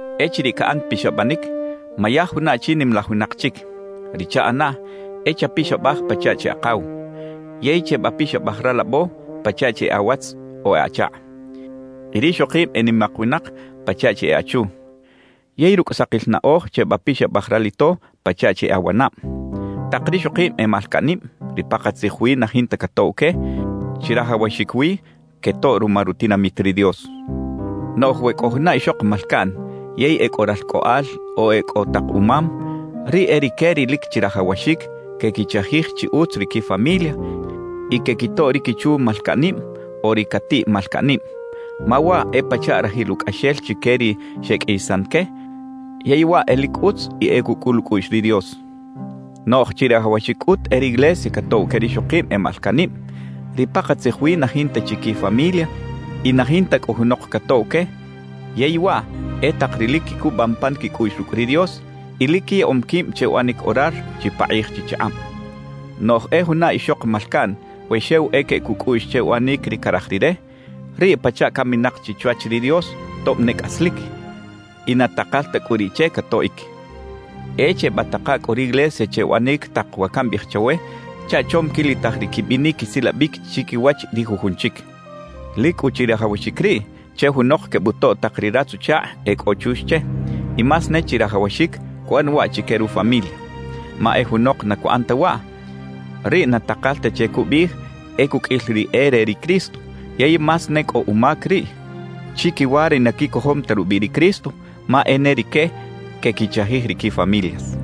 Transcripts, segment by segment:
Echiriꞌ caꞌan pixabanic, mayaj juna achi nimalaj winak chic; ri chaꞌana e chapixabaj pachaꞌ chi akaw; yey chebapixabaj ralabo pachaꞌ chi e awatz o e achakꞌ y rixokib e nimak winak pachaꞌ chi e achu. Yey rucꞌ sakil anaꞌoj chebapixabaj ralito pachaꞌ chi e awanab. Tak rixokib e malcaꞌnib, ri pakatzij wi na jinta catoꞌw que, chirajawaxic wi quetoꞌ ruma rutinamit ri Dios. Noꞌj we cꞌo juna ixok malcaꞌn yey e cꞌo ralcꞌoꞌal o e cꞌo tak umam, riꞌ e rique ri lic chirajawaxic quequichajij chi utz ri quifamilia y quequitoꞌ ri quichu malcaꞌnib o ri catiꞌ malcaꞌnib, ma waꞌ e pachaꞌ rajil ucꞌaxel chique ri xeqꞌuiyisan que, yey waꞌ e lic utz y e cucꞌul ucꞌuꞌx ri Dios. Noꞌj chirajawaxic cꞌut e riglesia catoꞌw que rixokib e malcaꞌnib, ri pakatzij wi na jinta chi quifamilia y na jinta cꞌu junok catoꞌw que, yey waꞌ e tak ri lic quicubam pan quicꞌuꞌx rucꞌ ri Dios y lic quiyaꞌom quib che uꞌanic orar chipakꞌij chichakꞌab. Noꞌj e juna ixok malcaꞌn we xew e queꞌec ucꞌuꞌx che uꞌanic ri caraj rire, riꞌ pachaꞌ caminak chi chwach ri Dios tob ne cꞌaslic, y na takal ta cꞌu riꞌ che catoꞌic. E chebataka cꞌu riglesia che uꞌanic tak wa cambiꞌij chawe chaꞌ chom quilitaj ri quibinic quisilabic chiquiwach ri jujun chic. Lic cꞌu chirajawaxic riꞌ che junok quebutoꞌ tak ri ratz-uchakꞌ e cꞌo chux che, y más ne chirajawaxic cuꞌan waꞌ chique rufamilia. Ma e junok na cuꞌan ta waꞌ, riꞌ na takal ta che cubiꞌij e cuqꞌuil ri e re ri Cristo, yey más ne cꞌo umac riꞌ chiquiwa ri na quicojom ta rubiꞌ ri Cristo, ma e ne rique quequichajij ri quifamilias.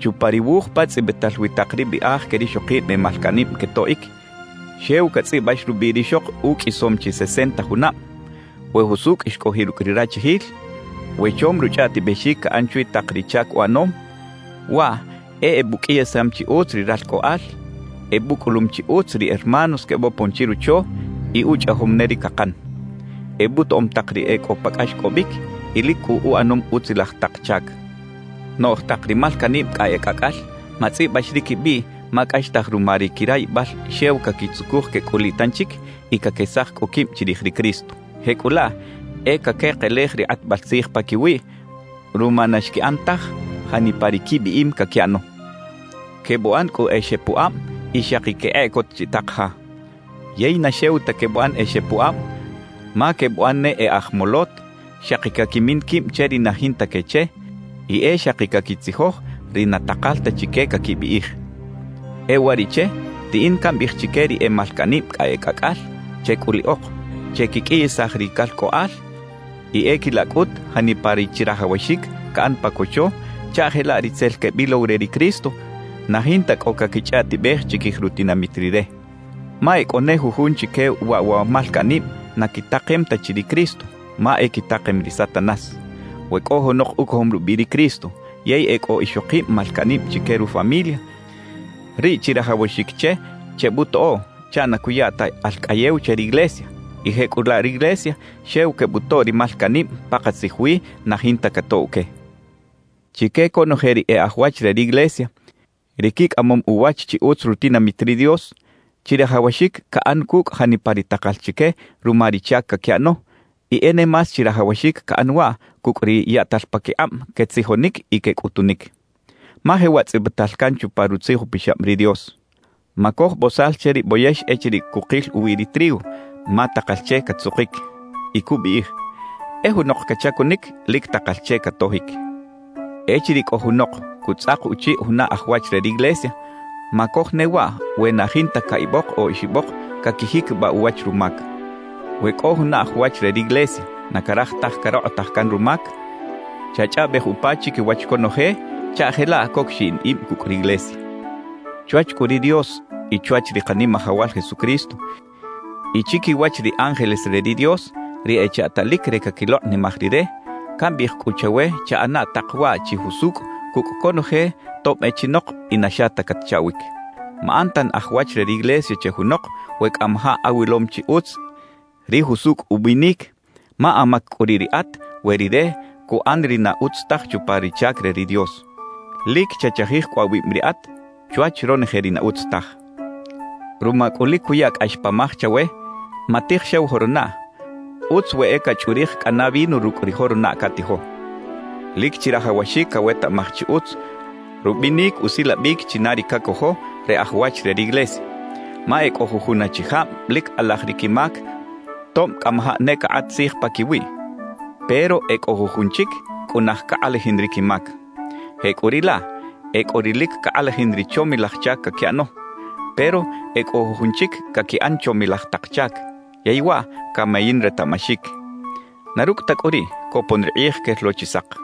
Chupa ri wuj pa tzꞌibital wi tak ri biꞌaj que rixokib e malcaꞌnib quetoꞌic, xew catzꞌibax rubiꞌ rixok uqꞌuisom chi sesenta junab, we jusucꞌ xcꞌojiꞌ rucꞌ ri rachijil, we chom ruchꞌaꞌtibexic caꞌan chwi tak ri chac uꞌanom, waꞌ e ebuqꞌuiyisam chi utz ri ralcꞌoꞌal, ebucꞌulum chi utz ri hermanos quebopon chirocho y uchꞌajom ne ri cakan, ebutoꞌom tak ri e cꞌo pa cꞌaxcꞌobic y lic cꞌu uꞌanom utzilaj tak chac. Noꞌj tak ri malcaꞌnib cꞌa e cꞌacꞌal, matzꞌibax ri quibiꞌ ma cꞌaxtaj ruma ri quirayibal xew caquitzucuj quecꞌuliꞌ tanchic y caquesaj cꞌu quib chirij ri Cristo. Jecꞌulaꞌ e caquekelej ri kꞌatbal tzij paquiwiꞌ ruma na xquiꞌan taj janipa ri quibiꞌim caquiꞌano. Quebuꞌan cꞌu e xepuꞌab y xaki quekꞌeꞌcot chiꞌtak ja. Yey na xew ta quebuꞌan e xepuꞌab, ma quebuꞌan ne e aj molot, xaki caquimin quib che ri na jinta que che y e xaki caquitzijoj ri na takal ta chique caquibiꞌij. E uwariꞌche riꞌin cambiꞌij chique ri e malcaꞌnib cꞌa e cꞌacꞌal, checꞌuliꞌok, chequiqꞌuiyisaj ri calcꞌoꞌal y e quilaꞌ cꞌut janipa ri chirajawaxic caꞌan pa cocho chaꞌ jelaꞌ ri tzel quebilow re ri Cristo na jinta cꞌo caquichꞌaꞌtibej chiquij rutinamit Rire. Ma e cꞌo ne jujun chique waꞌ wa malcaꞌnib na quitakem ta chi ri Cristo, ma e quitakem ri Satanás. We cꞌo junok ucojom rubiꞌ ri Cristo yey e cꞌo ixokib malcaꞌnib chique rufamilia, riꞌ chirajawaxic che chebutoꞌoꞌ chaꞌ na cuya ta alcꞌayew che riglesia, y jecꞌulaꞌ riglesia xew quebutoꞌ ri malcaꞌnib pakatzij wi na jinta catoꞌw que. Chique conoje ri e aj wach re riglesia, ri quicꞌamom uwach chi utz rutinamit ri Dios, chirajawaxic caꞌan cucꞌ janipa ri takal chique ruma ri chac caquiꞌano; y e ne más chirajawaxic caꞌan waꞌ cucꞌ ri yaꞌtal paquikꞌab quetzijonic y quecꞌutunic. Ma jewaꞌ tzꞌibital can chupa Rutzij Upixab ri Dios: «Macoj bozal che ri boyex echiriꞌ cukil uwi ri trigo, ma takal che catzukic.» Y cubiꞌij: «E junok cachacunic, lic takal che catojic.» Echiriꞌ cꞌo junok cutzꞌak uchiꞌ juna aj wach re riglesia; macoj ne waꞌ we na e jinta caꞌibok o oxibok caquijiquibaꞌ uwach rumac. We cꞌo juna aj wach re riglesia na caraj taj carokꞌotaj can rumac, chachꞌaꞌbej upa chiquiwach conoje chaꞌ jelaꞌ coc xiꞌin ib cucꞌ riglesia. Chwach cꞌu ri Dios y chwach ri Kanimajawal Jesucristo y chiquiwach ri ángeles re ri Dios ri echaꞌtalic re caquilokꞌnimaj Rire, cambiꞌij cꞌu chawe chaꞌana tak waꞌ chi jusucꞌ cucꞌ conoje tob e chinok y na xa ta catchaꞌwic. Maꞌan tan aj wach re riglesia che junok we cꞌamajaꞌ awilom chi utz ri jusucꞌ ubinic, ma amac cꞌu riꞌ riꞌat we rire cuꞌan ri na utz taj chupa ri chac re ri Dios. Lic chachajij cꞌu awib riꞌat chwach ronoje ri na utz taj. Ruma cꞌu lic cuya cꞌax pamaj chawe, matij xew joronaꞌ, utz we e cachꞌurij cꞌana vino rucꞌ ri joronaꞌ catijo. Lic chirajawaxic cawetaꞌmaj chi utz rubinic usilabic china ri cacojo re aj wach re riglesia. Ma e cꞌo jujun achijab lic kꞌalaj ri quimac tob cꞌamajaꞌ ne cakꞌat tzij paquiwiꞌ; pero e cꞌo jujun chic cꞌunaj cakꞌalajin ri quimac. Jecꞌuriꞌlaꞌ, e cꞌo ri lic cakꞌalajin ri chomilaj chac caquiꞌano; pero e cꞌo jujun chic caquiꞌan chomilaj tak chac, yey waꞌ camayin retaꞌmaxic. Na rucꞌ ta cꞌu riꞌ, copon ri kꞌij quel lo chi sak.